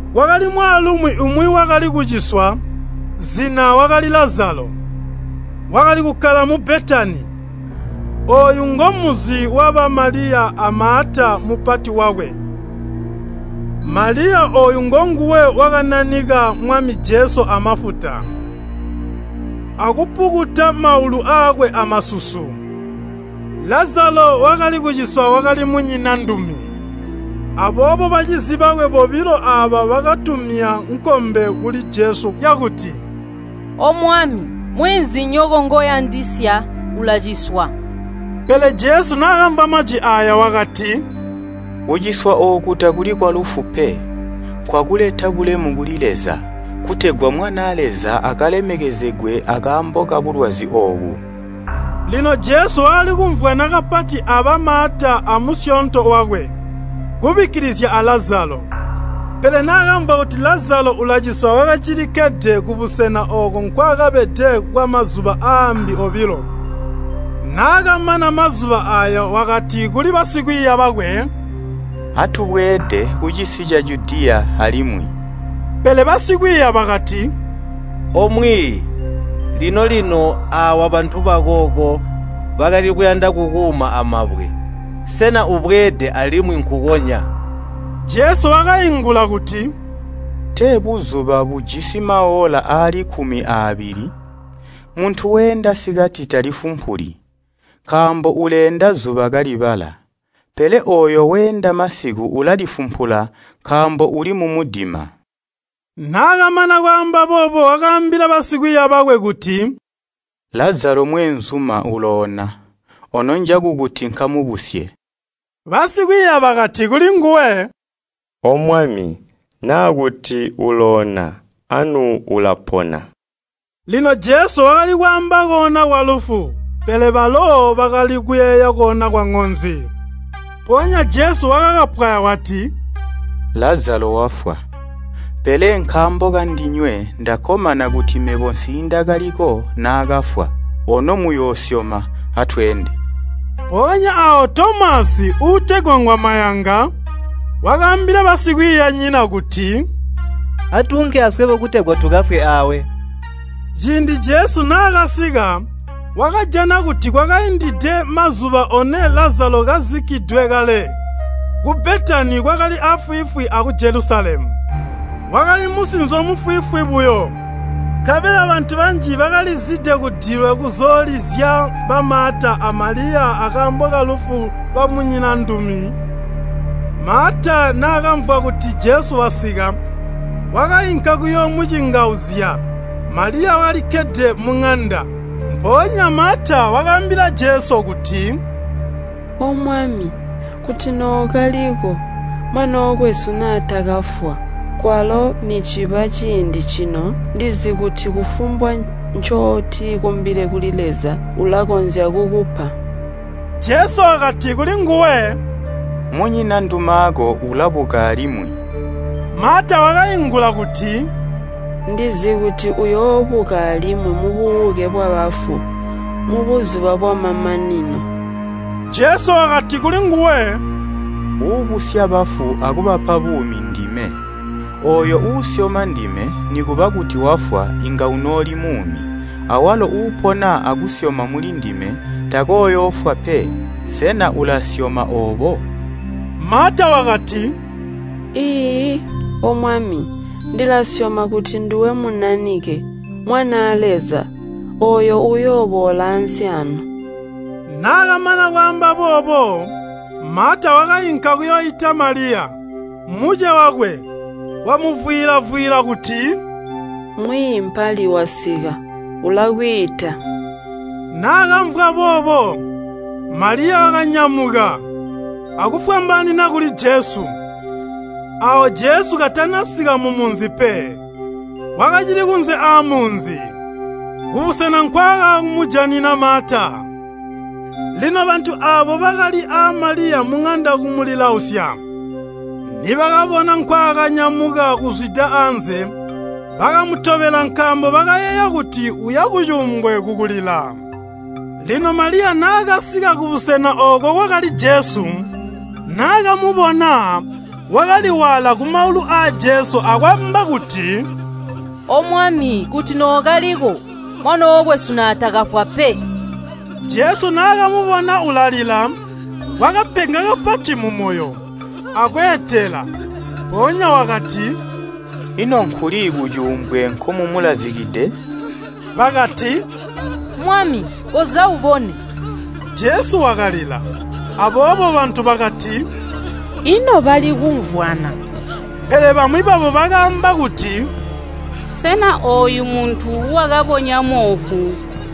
Kwakali mwaalumi umwi wakali kuciswa, zina wakali Lazalo, wakali kukkala mu Betani. Ooyu ngomunzi waba Maliya a Maata mupati wakwe. ( Maliya ooyu ngonguwe wakananika Mwami Jesu amafuta, akupukuta maulu aakwe amasusu. Lazalo wakali kuciswa wakali munyinandumi.) Aboobo bacizi bakwe bobilo aaba bakatumya nkkombe kuli Jesu yakuti, “O Mwami, mweenzinyoko ngoyandisya ulaciswa.” Pele Jesu naakamvwa majwi aaya wakati, “Kuciswa ooku takuli kwalufu pe. Nkwakuleta bulemu kuli Leza, kutegwa Mwanaa Leza akalemezegwe akaambo kabulwazi oobu.” Lino Jesu wakali kumvwana kapati aba Maata amusyoonto wakwe, kubikkilizya a Lazalo. Pele naakamvwa kuti Lazalo ulaciswa wakacilikkede kubusena ooko nkwaakabede kwamazuba aambi obilo. Naakamana mazuba aaya wakati kuli basikwiiya bakwe, “Atubweede kucisi ca Judiya alimwi.” Pele basikwiiya bakati, “O Mwiiyi, lino-lino aawa bantu bakooko bakali kuyanda kukuuma amabwe, sena ubweede alimwi nkukonya?” Jesu wakaingula kuti, “Tee buzuba bujisi maoola aali kkumi aabili? Muntu weenda sikati talifumpuli, nkaambo uleenda zuba kalibala. Pele ooyo weenda masiku ulalifumpula nkaambo uli mumudima.” Naakamana kwaamba boobo wakaambila basikwiiya bakwe kuti, “Lazalo, mweenzuma uloona, ono njakukuti nkamubusye.” Basikwiiya bakati kulinguwe, “O Mwami, naa kuti uloona anu ulapona.” Lino Jesu wakali kwaamba koona kwalufu, pele balo bakali kuyeeya koona kwaŋonzi. Mpoonya Jesu wakakapwaya wati, “Lazalo wafwa. Pele nkaambo kandinywe ndakkomana kuti mebo nsiindakaliko naakafwa, ono muyakusyoma. Atweende.” Mpoonya aawo Tomasi, uutegwa ngwamayanga, wakaambila basikwiiyanyina kuti, “Atuunke aswebo kutegwa tukafwe aawe.” Ciindi Jesu naakasika, wakajana kuti kwakaindide mazuba one Lazalo kazikkidwe kale. Ku Betani kwakali afwiifwi aku Jelusalemu, wakali musinzo mufwiifwi buyo. Nkabela bantu banji bakalizide kudilwe kuzoolizya ba Maata a Maliya akaambo kalufu lwamunyinandumi. Maata naakamvwa kuti Jesu wasika, wakainka kuyoomucingauzya, Maliya wakalikkede muŋanda. Mpoonya Maata wakaambila Jesu kuti, “O Mwami, kuti nookaliko, mwanookwesu naatakafwa. Kwalo niciba ciindi cino ndizi kuti kufumbwa ncotikumbile kuli Leza, ulakonzya kukupa.” Jesu wakati kulinguwe, “Munyinandumaako ulabuka alimwi.” Maata wakaingula kuti, “Ndizi kuti uyoobuka alimwi mububuke bwabafu, mubuzuba bwamamanino.” Jesu wakati kulinguwe, “Uubusya bafu akubapa buumi ndime. Ooyo uusyoma ndime, nikuba kuti wafwa, inga unooli muumi. Awalo uupona akusyoma mulindime, takooyoofwa pe. Sena ulasyoma oobo?” Maata wakati, “Iiyi, O Mwami, ndilasyoma kuti nduwe Munanike, Mwanaa Leza, ooyo uuyooboola ansi aano.” Naakamana kwaamba boobo, Maata wakainka kuyooita Maliya, muce wakwe, wamuvwiila-vwiila kuti, “Mwiiyi mpali wasika, ulakwiita.” Naakamvwa boobo, Maliya wakanyamuka, akufwambaanina kuli Jesu. ( Aawo Jesu katanasika mumunzi pe, wakacili kunze aamunzi, kubusena nkwaakamujanina Maata.) Lino bantu aabo bakali aa Maliya muŋanda kumulilausya, nibakabona nkwaakanyamuka kuzwida anze, bakamutobela nkaambo bakayeeya kuti uya kucuumbwe kukulila. Lino Maliya naakasika kubusena ooko kwakali Jesu, naakamubona, wakaliwaala kumaulu aa Jesu akwaamba kuti, “O Mwami, kuti nookaliko, mwanookwesu naatakafwa pe.” Jesu naakamubona ulalila, wakapenga kapati mumoyo, akweetela. Mpoonya wakati, “Ino nkuli kucuumbwe nkomumulazikide?” Bakati, “Mwami, koza ubone.” Jesu wakalila. Aboobo bantu bakati, “Ino bali kumvwana!” Pele bamwi babo bakaamba kuti, “Sena ooyu muntu wakabonya moofu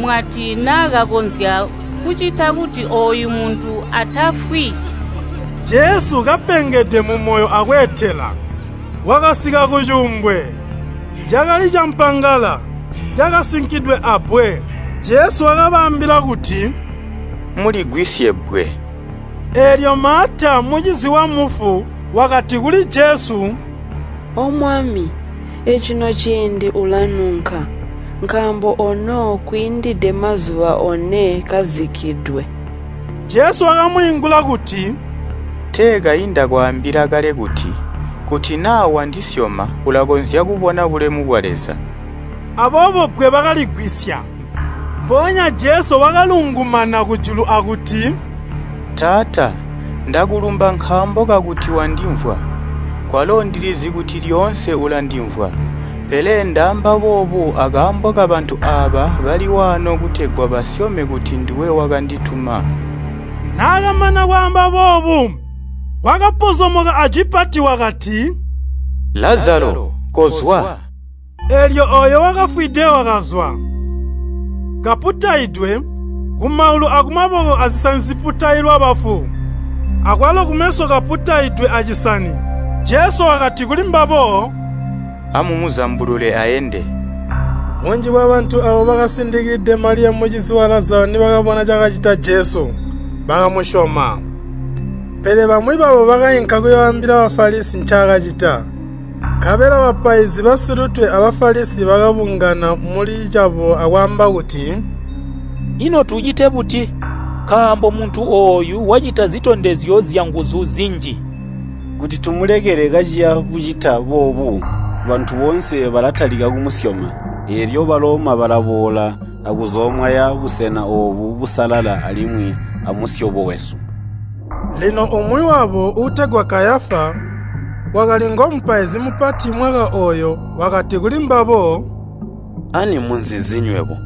mwati naakakonzya kucita kuti ooyu muntu atafwi?” Jesu, kapengede mumoyo akweetela, wakasika kucuumbwe, cakali campangala, cakasinkidwe abbwe. Jesu wakabaambila kuti, “Muligwisye bbwe.” Eelyo Maata, mucizi wamufu, wakati kuli Jesu, “O Mwami, ecino ciindi ulanunka, nkaambo ono kwiindide mazuba one kazikkidwe.” Jesu wakamwiingula kuti, “Tee kayi ndakwaambila kale kuti, kuti naa wandisyoma ulakonzya kubona bulemu bwa Leza?” Aboobo bbwe bakaligwisya. Mpoonya Jesu wakalungumana kujulu akuti, “Taata, ndakulumba nkaambo kakuti wandimvwa. Kwalo ndilizi kuti lyoonse ulandimvwa, pele ndaamba boobu akaambo kabantu aaba bali waano kutegwa basyome kuti nduwe wakandituma.” Naakamana kwaamba boobu, wakapozomoka ajwi pati wakati, “Lazalo, kozwa.” Eelyo ooyo wakafwide wakazwa, kaputaidwe, kumaulu akumaboko azisani ziputailwa bafu, akwalo kumeso kaputaidwe acisani. Jesu wakati kulimbabo, “Amumuzambulule aende.” Bunji bwa bantu aabo bakasindikilide Maliya mucizi wa Lazalo nibakabona cakacita Jesu, bakamusyoma. Pele bamwi babo bakainka kuyooambila Bafalisi ncaakacita. Nkabela bapaizi basilutwe a Bafalisi bakabungana muli cabo akwaamba kuti, “Ino tucite buti? Nkaambo muntu ooyu wacita zitondezyo zyanguzu zinji! Kuti tumulekele kaciya bucita boobu, bantu boonse balatalika kumusyoma, eelyo Baloma balaboola akuzoomwaya busena oobu busalala alimwi amusyobo wesu.” Lino umwi wabo, uutegwa Kayafa, wakali ngomupaizi mupati mwaka ooyo, wakati kulimbabo, “Ani muzi nzi nywebo?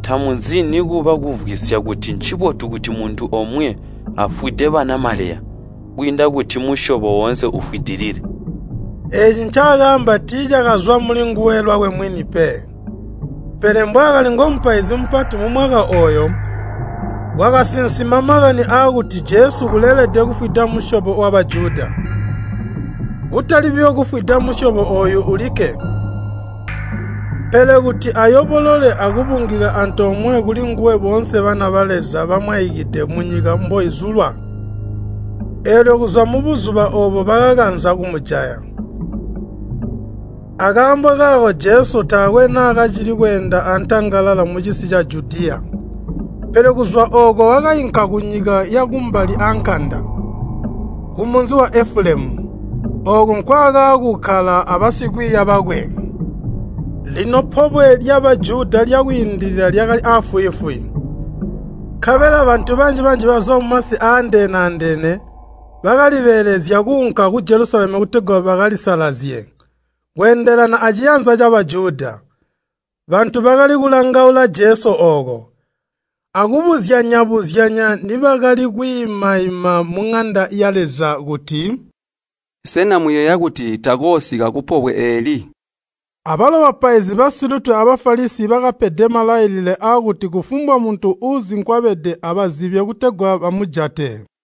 Tamuzi nikuba kumvwisya kuti ncibotu kuti muntu omwe afwide banamaleya kwiinda kuti musyobo woonse ufwidilile.” Eeci ncaakaamba tiicakazwa mulinguwe lwakwe mwini pe, pele mbwaakali ngomupaizi mupati mumwaka ooyo, wakasinsima makani aakuti Jesu uleelede kufwida musyobo wa Bajuda. Kutali buyo kufwida musyobo ooyo ulikke, pele kuti ayobolole akubungika antoomwe kulinguwe boonse bana ba Leza bamwaikide munyika mboizulwa. Eelyo kuzwa mubuzuba oobo bakakanza kumujaya. Akaambo kaako Jesu taakwe naakacili kweenda antangalala mucisi ca Judiya, pele kuzwa ooko wakainka kunyika yakumbali aankanda, kumunzi wa Efulemu. Ooko nkwaakaakukkala abasikwiiya bakwe. Lino Pobwe lya Bajuda lya Kwiindilila lyakali aafwiifwi, nkabela bantu banji bazwa mumasi aandeene-andeene bakalibeelezya kuunka ku Jelusalemu kutegwa bakalisalazye kweendelana aciyanza ca Bajuda. Bantu bakali kulangaula Jesu ooko, akubuzyanya-buzyanya nibakali kwiimaima muŋanda ya Leza kuti, “Sena muyeeya kuti takoosika kupobwe eeli?” Abalo bapaizi basilutwe a Bafalisi bakapede malailile aakuti kufumbwa muntu uuzi nkwabede abazibye kutegwa bamujate.